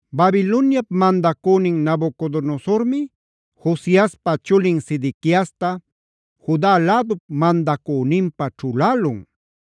Babiloniap mandacünin Nabucodonosormi Josiaspa chulin Sedequiasta Juda lädup mandacüninpä ćhulälun.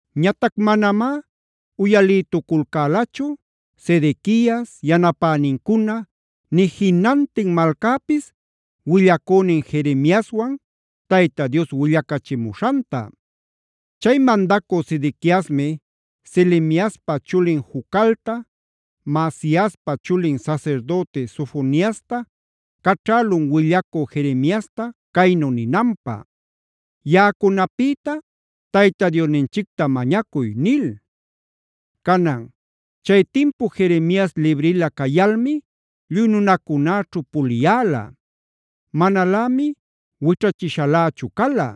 Ñatac manamá uyalïtuculcälachu Sedequias, yanapänincuna, nï jinantin malcäpis willacünin Jeremiaswan Tayta Dios willacachimuśhanta. Chay mandacü Sedequiasmi Selemiaspa chulin Jucalta, Maasiaspa chulin sasirdüti Sofoniasta caćhälun willacü Jeremiasta caynu ninanpä: “Yaꞌacunapïta Tayta Diosninchicta mañacuy” nil. Canan chay timpu Jeremias librila cayalmi lluy nunacunäćhu puliyäla. Manalämi wićhachishalächu cala.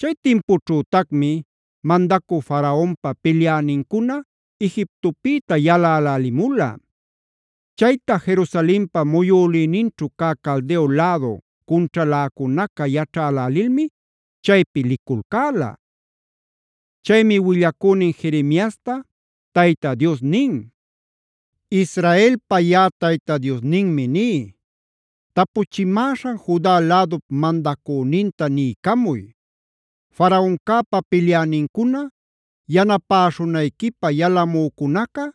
Chay timpućhütacmi mandacü Faraonpa pilyänincuna Egiptopïta yalälälimula. Chayta Jerusalenpa muyülïninćhu cä Caldeo lädu cunćhaläcunaca yaćhälälilmi chaypi liculcäla. Chaymi willacünin Jeremiasta Tayta Dios nin: “Israelpa yaꞌa Tayta Diosninmi ní: Tapuchimäśhan Juda lädup mandacüninta niycamuy: ‘Faraoncäpa pilyänincuna yanapäśhunayquipä yalamücunaca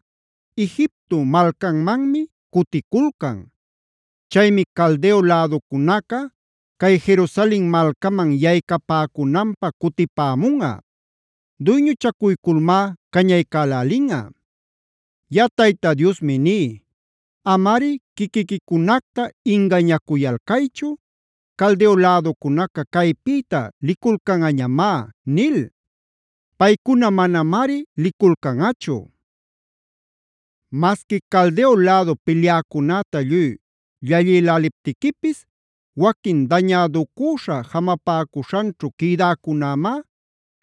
Egipto malcanmanmi cuticulcan. Chaymi Caldeo läducunaca cay Jerusalen malcaman yaycapäcunanpä cutipämunꞌa; duyñuchacuyculmá cañaycälälinꞌa. “ ‘Yaꞌa Tayta Diosmi ní: Amari quiquiquicunacta ingañacuyalcaychu, “Caldeo läducunaca caypïta liculcanꞌañamá” nil. Paycuna manamari liculcanꞌachu. Masqui Caldeo lädu pilyäcunäta lluy llallïläliptiquipis, waquin dañäducüśha jamapäcuśhanćhu quïdäcunämá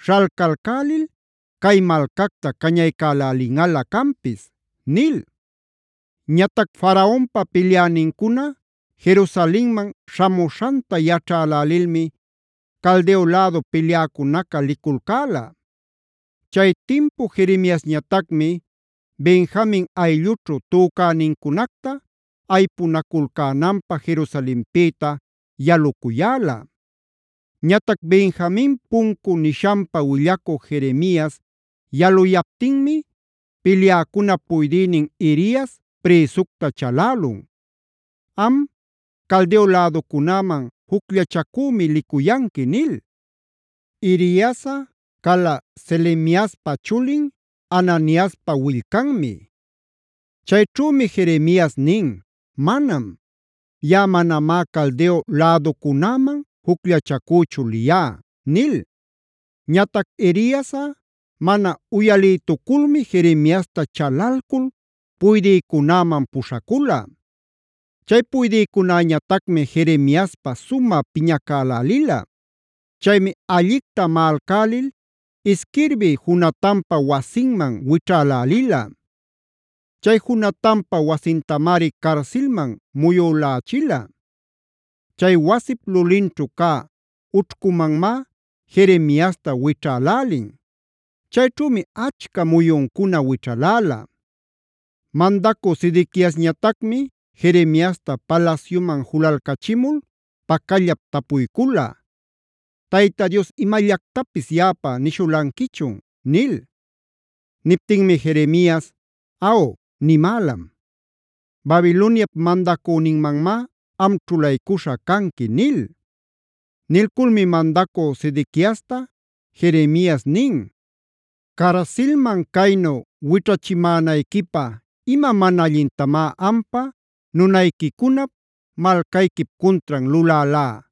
śhalcalcälil cay malcacta cañaycälälinꞌalä canpis’” nil. Ñatac Faraonpa pilyänincuna Jerusalenman śhamuśhanta yaćhälälilmi Caldeo lädu pilyäcunaca liculcäla. Chay timpu Jeremiasñatacmi Benjamin ayllućhu tücänincunacta aypunaculcänanpä Jerusalenpïta yalucuyäla. Ñatac Benjamin puncu nishanpa willacü Jeremias yaluyaptinmi pilyäcunap puydïnin Irias prïsucta chalälun: “Am, Caldeo läducunäman jucllachacümi licuyanqui” nil. Iriasꞌa cala Selemiaspa chulin, Hananiaspa willcanmi. Chayćhümi Jeremias nin: “Manam. Yaꞌa manamá Caldeo läducunäman jucllachacüchu liyá” nil. Ñatac Iriasꞌa mana uyaliytuculmi Jeremiasta chalalcul puydïcunäman puśhacula. Chay puydïcunäñatacmi Jeremiaspä sumä piñacälälila. Chaymi allicta maꞌalcälil isquirbï Jonatanpa wasinman wićhälälila. Chay Jonatanpa wasintamari carsilman muyülächila. Chay wasip lulinćhu cä ućhcumanmá Jeremiasta wićhälälin. Chayćhümi achca muyuncuna wićhaläla. Mandacü Sedequiasñatacmi Jeremiasta palasyuman julalcachimul pacallap tapuycula: “¿Tayta Dios imallactapis yaꞌapä nishulanquichun?” nil. Niptinmi Jeremias: “Aw, nimälam. Babiloniap mandacüninmanmá am ćhulaycuśha canqui” nil. Nilculmi mandacü Sedequiasta Jeremias nin: “Carsilman caynu wićhachimänayquipä, ¿ima mana allintamá ampa, nunayquicunap, malcayquip cuntran lulälá?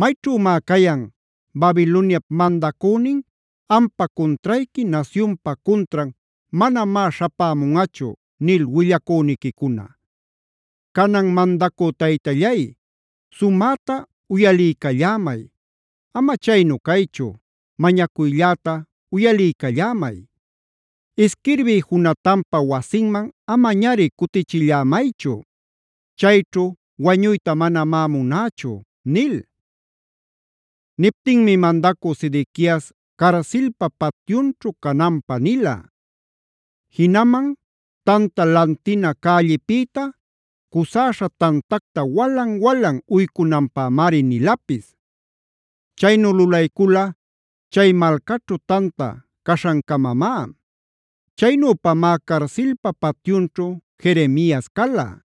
¿Mayćhümá cayan: ‘Babiloniap mandacünin ampa cuntrayqui, nasyunpa cuntran manamá śhapämunꞌachu’ nil willacüniquicuna? Canan, mandacü taytallay, sumäta uyaliycallämay, ama chaynu caychu, mañacuylläta uyaliycallämay: Isquirbï Jonatanpa wasinman amañari cutichillämaychu. Chayćhu wañuyta manamá munächu” nil. Niptinmi mandacü Sedequias carsilpa patyunćhu cananpä nila. Jinaman Tanta Lantina cällipïta, cusäśha tantacta walan-walan uycunanpämari nilapis. Chaynu lulaycula chay malcaćhu tanta caśhancamamá. Chaynüpamá carsilpa patyunćhu Jeremias cala.